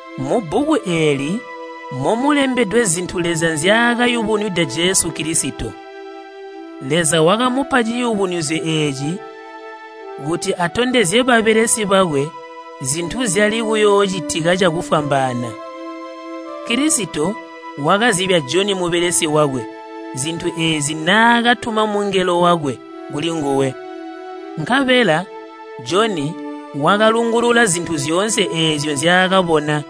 Mubbuku eeli momulembedwe zintu Leza nzyaakayubunwida Jesu Kilisito. Leza wakamupa ciyubunuzyo eeci kuti atondezye babelesi bakwe zintu zyali kuyoocitika cakufwambaana. Kilisito wakazibya Joni mubelesi wakwe zintu eezi naakatuma mungelo wakwe kulinguwe. Nkabela Joni wakalungulula zintu zyoonse eezyo nzyaakabona.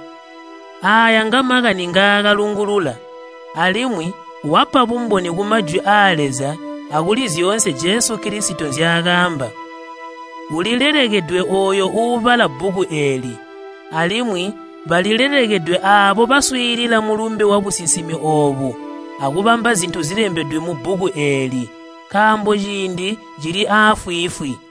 Aaya ngamakani ngaakalungulula alimwi wapa bumboni ku Majwi aa Leza akuli zyoonse Jesu Kilisito nzyaakaamba. Ulilelekedwe ooyo uubala bbuku eeli, alimwi balilelekedwe aabo baswiilila mulumbe wabusinsimi oobu akubamba zintu zilembedwe mubbuku eeli! Nkaambo ciindi cili aafwiifwi.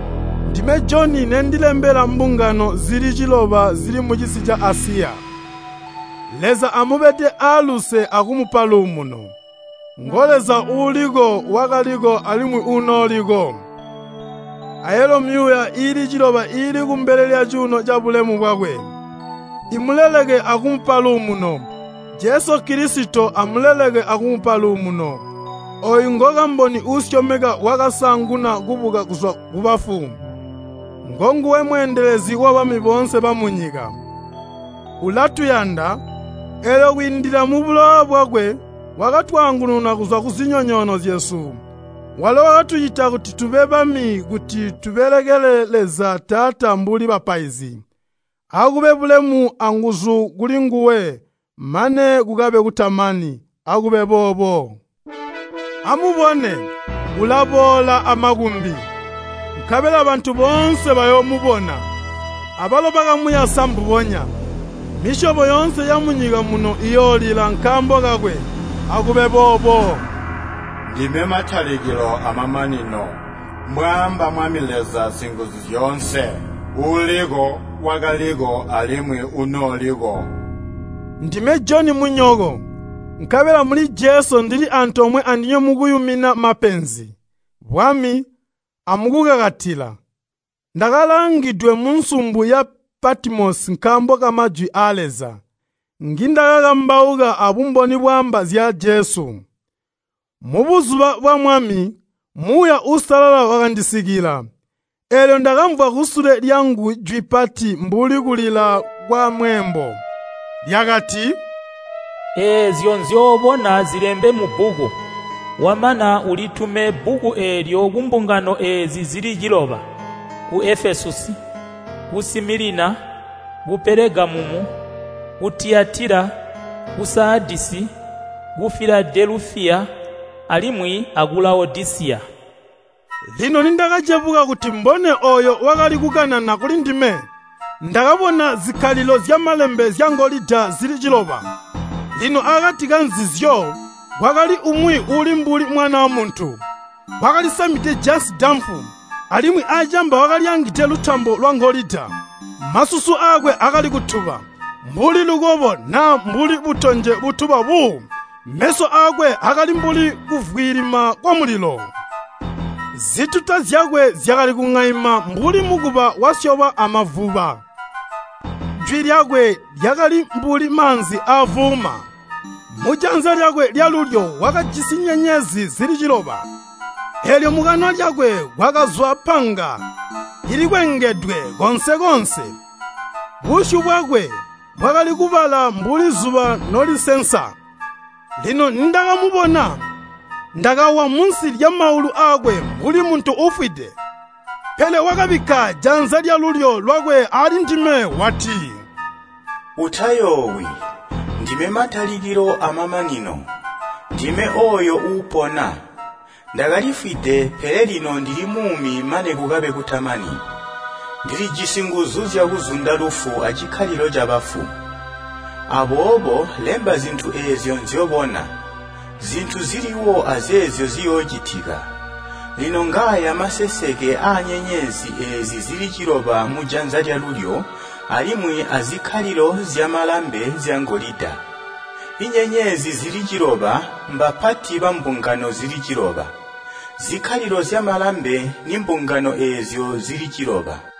Ndime Joni nendilembela mbungano zili ciloba zili mucisi ca Asiya, Leza amubede aaluse akumupa luumuno, ngo Leza Uuliko, Wakaliko alimwi Uunooliko. Ayalo myuuya iili ciloba iili kumbele lyacuuno cabulemu bwakwe, iimuleleke akumupa luumuno. Jesu Kilisito amuleleke akumupa luumuno, ooyu ngokamboni uusyomeka wakasaanguna kubuka kuzwa kubafu, ngonguwe mweendelezi wabami boonse bamunyika. Ulatuyanda, eelyo kwiindila mubulowa bwakwe wakatwaangununa kuzwa kuzinyonyoono zyesu. Walo wakatucita kuti tube bami kuti tubelekele Leza Taata mbuli bapaizi. Akube bulemu anguzu kulinguwe mane kukabe kutamani. Akube boobo. Amubone, ulaboola amakumbi! Nkabela bantu boonse bayoomubona, abalo bakamuyasa mbubonya. Misyobo yoonse yamunyika muno iyoolila nkaambo kakwe. Akube boobo! “Ndime matalikilo amamanino,” mbwaamba Mwami Leza Singuzuzyoonse, Uuliko, Wakaliko, alimwi Uunooliko. Ndime Joni munyoko, nkabela muli Jesu ndili antoomwe andinywe mukuyumina mapenzi, bwami, amukukakatila. Ndakalaangidwe munsumbu ya Patimosi nkaambo kamajwi aa Leza ngindakakambauka abumboni bwaamba zya Jesu. Mubuzuba bwa Mwami, Muuya Uusalala wakandisikila, eelyo ndakamvwa kusule lyangu jwi pati mbuli kulila kwamweembo. Lyakati, “Eezyo nzyobona zilembe mubbuku, wamana ulitumine bbuku eelyo kumbungano eezi zili ciloba, ku Efesusi, ku Similina, ku Pelegamumu, ku Tiyatila, ku Saadisi, ku Filadelufiya, alimwi aku Lawodisiya.” Lino nindakacebuka kuti mbone ooyo wakali kukanana kulindime, ndakabona zikkalilo zyamalambe zyangolida zili ciloba. Lino akati kanzizyo kwakali umwi uuli mbuli Mwanaa Muntu, wakalisamide jansi damfu alimwi acamba wakalyaangide lutambo lwangolida. Masusu aakwe akali kutuba mbuli lukobo naa mbuli butonje butuba buu. Meso aakwe akali mbuli kuvwilima kwamulilo. Zituta zyakwe zyakali kuŋaima mbuli mukuba wasyobwa amavuba. Jwi lyakwe lyakali mbuli maanzi aavuuma. Mujanza lyakwe lyalulyo wakajisi nyenyezi zili ciloba, eelyo mukanwa lyakwe mwakazwa panga likwengedwe koonse-koonse. Busyu bwakwe bwakali kubala mbuli zuba nolisensa. Lino nindakamubona, ndakawa munsi lyamaulu aakwe mbuli muntu uufwide. Pele wakabikka janza lyalulyo lwakwe aalindime wati, “Utayoowi! Ndime matalikilo amamanino. Ndime ooyo uupona! Ndakalifwide pele lino ndili muumi mane kukabe kutamani. Ndilijisi nguzu zyakuzunda lufu acikkalilo cabafu. Aboobo lemba zintu eezyo nzyobona, zintu ziliwo azeezyo ziyoocitika. Lino ngaaya maseseke aanyenyezi eezi zili ciloba mujanza lyalulyo alimwi azikkalilo zyamalambe zyangolida. Inyenyezi zili ciloba mbapati bambungano zili ciloba, zikkalilo zyamalambe nimbungano eezyo zili ciloba.